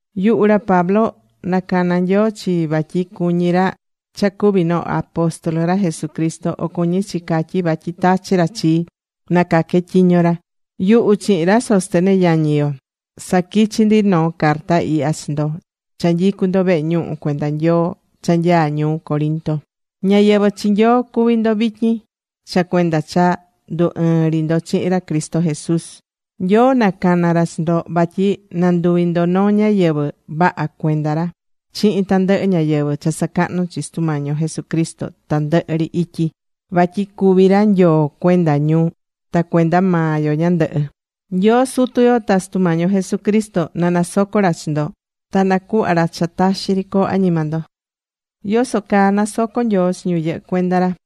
Yuhu ra Pablo, nacana̱ Nyoo chii vatyi cuñí ra cha cuvi noo apóstol ra Jesucristo, o cuñí chi catyí vatyi tachi ra chii nacaque tyiño ra. Yuhu chihin ra Sóstenes yañi yo saquichí ndi noo carta ihya chi ndo cha nyicú ndo vehe ñuhu cuenda Nyoo cha nyaá ñuu Corinto. Ñáyɨvɨ chi Nyoo cuví ndo vityin, cha cuenda cha ndu ɨɨ̱n ri ndo chihin ra Cristo Jesús. Nyoo nacana̱ ra chi ndo vatyi nanduvi ndo noo ñáyɨvɨ vaha cuenda ra, chihin tandɨhɨ ñáyɨvɨ cha sacahnú chi Sutu Mañi yo Jesucristo tandɨhɨ ri ityi. Vatyi cuví ra Nyoo cuenda ñu ta cuenda maa yo ñandɨhɨ. Nyoo Sutu yo ta Sutu Mañi yo Jesucristo na nasoco ra chi ndo, ta nacuhva ra cha taxi ri coo añima ndo.Yoso caa nasocó Nyoo chi ñu yɨhɨ́ cuenda ra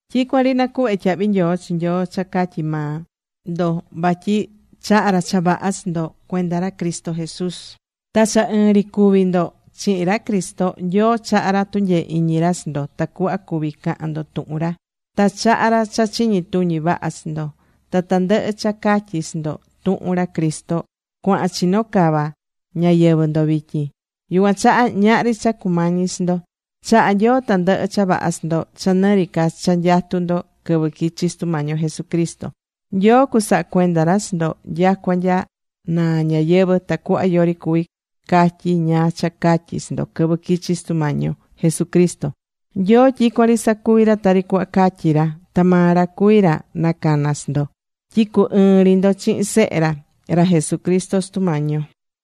Tyicuan ri nacuhvé tyahvi nyoo chi Nyoo cha catyi maa ndo, vatyi chaha̱ ra cha vaha chi ndo cuenda ra Cristo Jesús. Ta cha ɨɨn ri cuví ndo chihin ra Cristo, Nyoo chahá ra tunyee iñi ra chi ndo tacuhva cuvi cahán ndo tuhun ra. Ta chahá ra cha chiñi tuñi vaha chi ndo. Ta tandɨhɨ cha catyi̱ chi ndo, tuhun ra Cristo, cuahán chino cava ñayɨvɨ̱ ndo vityin. Yucuan chaha ñahri cha cumañí chi ndo. Chahá Nyoo tandɨhɨ cha vaha chi ndo cha nɨ ri ca cha nyatú ndo quɨvɨ quichi Sutu Mañi yo Jesucristo. Nyoo cusaha cuenda ra chi ndo nyacua nya naa ñayɨvɨ̱ tacuhva yori cuví catyi ñáá cha catyi chi ndo quɨvɨ quichi Sutu Mañi yo Jesucristo. Nyoo tyicuan ri sacuví ra tari cuhva catyi ra. Ta maa ra cuví ra nacana̱ chi ndo tyi cu ɨɨn ri ndo chihin Sehe ra, ra Jesucristo, Sutu Mañi yo.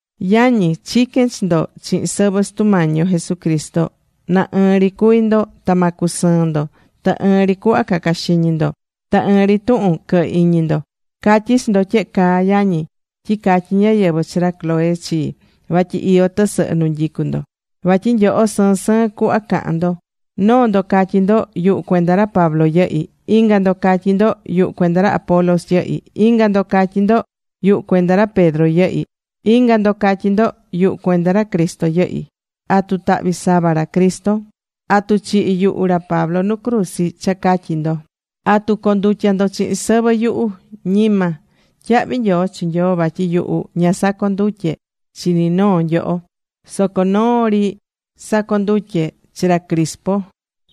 Yañi, chiquén chi ndo chihin sɨvɨ Sutu Mañi yo Jesucristo, na ɨɨn ri cuvi ndo ta ma cusɨɨn ndo. Ta ɨɨn ri cuhva ca̱ca xiñi ndo. Ta ɨɨn ri tuhun quɨ̱hɨ iñi ndo. Catyí chi ndo tyehe caa, yañi, tyi catyi̱ ñáyɨvɨ chi ra Cloé chii, vatyi iyó tɨsɨhɨ nu nyicú ndo. Vatyi nyoho sɨɨn sɨɨn cuhva cahán ndo. Noo ndo catyí ndo: “Yuhu, cuenda ra Pablo yɨhí.” Inga ndo catyí ndo: “Yuhu, cuenda ra Apolos yɨhí.” Inga ndo catyí ndo: “Yuhu, cuenda ra Pedro yɨhí.” Inga ndo catyí ndo: “Yuhu cuenda ra Cristo yɨhí.” ¿Atu tahvi̱ sava ra Cristo? ¿Atu chihi̱ yuhu ra Pablo nu cruzi cha catyi ndo? ¿Atu condutya̱ ndo chihin sɨvɨ yuhu? Ñima. Tyahvi nyoo chi Nyoo vatyi yuhu ña sacondutye̱ chi ni noo nyoho. Soco noo ri sacondutye̱ chi ra Crispo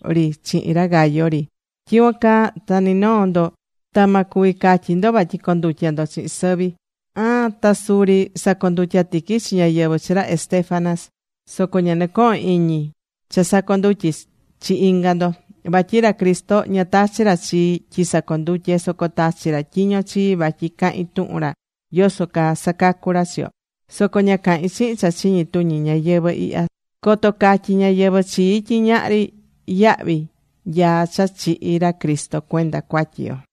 ri chihin ra Gayo ri. Tyicuan caa ta ni noo ndo ta ma cuvi catyi ndo vatyi condutya̱ ndo chihin sɨvi. Aan, ta suri sacondutya̱ tiqui chi ñáyɨvɨ chi ra Estéfanas. Soco ña nɨcohón iñi cha sacondutye chi inga ndo. Vatyi ra Cristo ña tachi̱ ra chii tyi sacondutye. Soco tachi̱ ra tyiño chii vatyi cahin tuhun ra yoso caa sacacú ra chi yo. Soco ña cahín chihin cha chiñi tuñi ñayɨvɨ̱ ihya, coto catyi ñáyɨvɨ chii tyi ñahri yahvi nyaá cha chihi̱ ra Cristo cuenda cuatyi yo.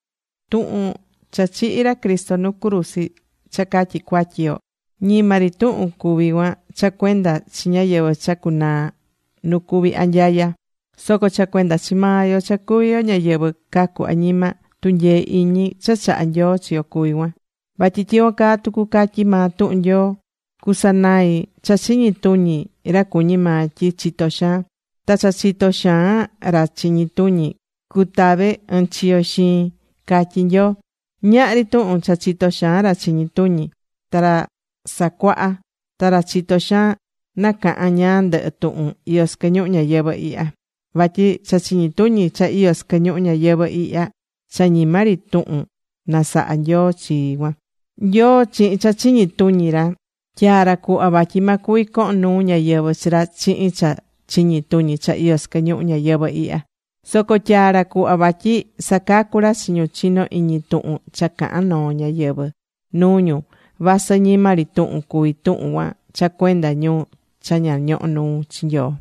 Tuhun cha chihi̱ ra Cristo nu cruzi cha catyi cuatyi yo, ñima ri tuhun cuví cuan cha cuenda chi ñáyɨvɨ cha cunaa nu cuví anyaya. Soco cha cuenda chi maa yo cha cuví yo ñáyɨvɨ cacú añima, tunyee iñi cha chahá Nyoo chi yo cuvi cuan. Vatyi tyicuan caa tucu catyí maa tuhun Nyoo: Cusanai cha chiñi tuñi ra cuñí maa tyi chitó xaan. Ta cha chitó xaan ra chiñi tuñi cutave ɨɨn chiyo xiin, catyí Nyoo. Ñahri tuhun cha chitó xaan ra chiñi tuñi, ta ra sacuaha, ta ra chitó xaan nacahan ñáá ndɨhɨ tuhun iyó sɨquɨ ñuhu ñayɨvɨ̱ ihya. Vatyi cha chiñi tuñi cha iyó sɨquɨ ñuhu ñayɨvɨ̱ ihya, cha ñima ri tuhun nasaha̱ Nyoo chi cuan. Nyoo chihin cha chiñi tuñi ra tyaá ra cuhva vatyi ma cuvi cohon nuu ñáyɨvɨ chi ra chihin cha chiñi tuñi cha iyó sɨquɨ ñuhu ñayɨvɨ̱ ihya, soco tyaá ra cuhva vatyi sacacú ra chi ñu chinó iñi tuhun cha cahan noo ñáyɨvɨ nuu ñu. Vasɨ ñima ri tuhun cuví tuhun cuan cha cuenda ñu cha ña ñohó nuu chi Nyoo.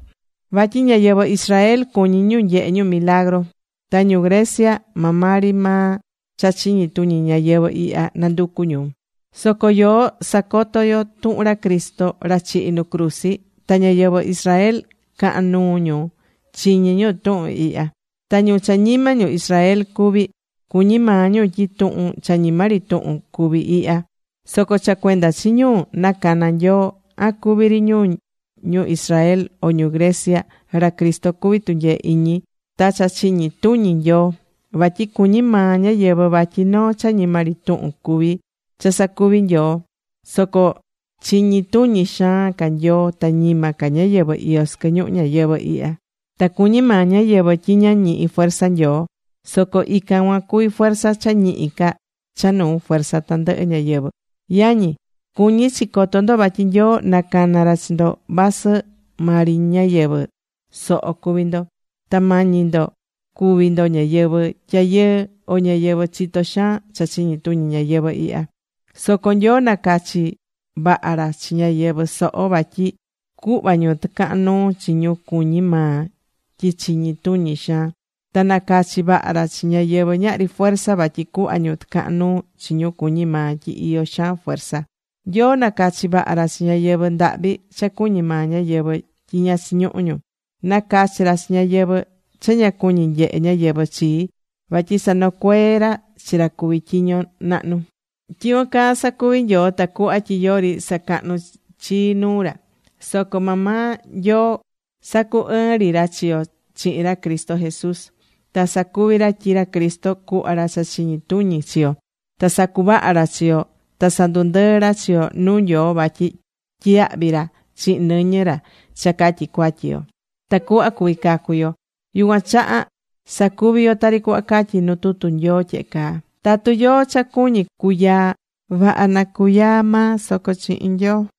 Vatyi ñáyɨvɨ Israel cuñí ñu nyehe ñu milagru. Ta ñu Grecia maa maa ri maa cha chiñi tuñi ñayɨvɨ̱ ihya nanducú ñu. Soco yoó sacotó yo tuhun ra Cristo, ra chihi̱ nu cruzi. Ta ñáyɨvɨ Israel cahán nuu ñu chiñí ñu tuhun ihya. Ta ñu cha ñima ñu Israel cuví, cuñí maa ñu tyi tuhun cha ñima ri tuhun cuví ihya. Soco cha cuenda chi ñu nacana̱ Nyoo, an cuví ri ñu ñu Israel, o ñu Grecia, ra Cristo cuví tunyee iñi ta cha chiñi tuñi Nyoo. Vatyi cuñí maa ñáyɨvɨ vatyi noo cha ñima ri tuhun cuví cha sacuvi̱ Nyoo. Soco chiñi tuñi xaan ca Nyoo ta ñima ca ñáyɨvɨ iyó sɨquɨ ñuhu ñayɨvɨ̱ ihya. Ta cuñí maa ñayɨvɨ tyi ña ñihí fuerza Nyoo. Soco ican cuan cuví fuerza cha ñihi ca cha nuu fuerza tandɨhɨ ñáyɨvɨ. Yañi, cuñí chi coto ndo vatyi Nyoo nacana̱ ra chi ndo vasɨ maa ri ñáyɨvɨ soho cuví ndo, ta mañi ndo cuví ndo ñáyɨvɨ tyayɨɨ o ñáyɨvɨ chitó xaan cha chiñi tuñi ñayɨvɨ̱ ihya. Soco Nyoo nacachi̱ vaha ra chi ñáyɨvɨ soho. Vatyi cuhvá ñu tɨcahan nuu chi ñu cuñí maa tyi chiñi tuñi xaan. Ta nacachi̱ vaha ra chi ñáyɨvɨ ñahri fuerza vatyi cuhva ñu tɨcahan nuu chi ñu cuñí maa tyi iyó xaan fuerza. Nyoo nacachi̱ vaha ra chi ñáyɨvɨ ndahvi cha cuñí maa ñáyɨvɨ tyi ña chiñuhú ñu. Nacachi̱ ra chi ñáyɨvɨ cha ña cuñí nyehe ñáyɨvɨ chii, vatyi sanocuee ra chi ra cuví tyiño nahnu. Tyicuan caa sacuvi̱ Nyoo tacuhva tyi yori sacahnú chii nuu ra. Soco maa maa Nyoo sacu ɨɨ̱n ri ra chi yo chihin ra Cristo Jesús. Ta sacuvi̱ ra tyi ra Cristo cuhva ra cha chiñi tuñi chi yo, ta sacuvaha̱ ra chi yo ta sandundɨɨ̱ ra chi yo nuu Nyoo vatyi tyiyahvi̱ ra chihin nɨñɨ ra cha catyi cuatyi yo, tacuhva cuvi cacu yo. Yucuan chaha sacuví yo tari cuhva catyí nu tutu Nyoo tyehe caa: “Tatu yóó cha cuñí cuyaa, vaha na cuyaa maa soco chihin Nyoo.”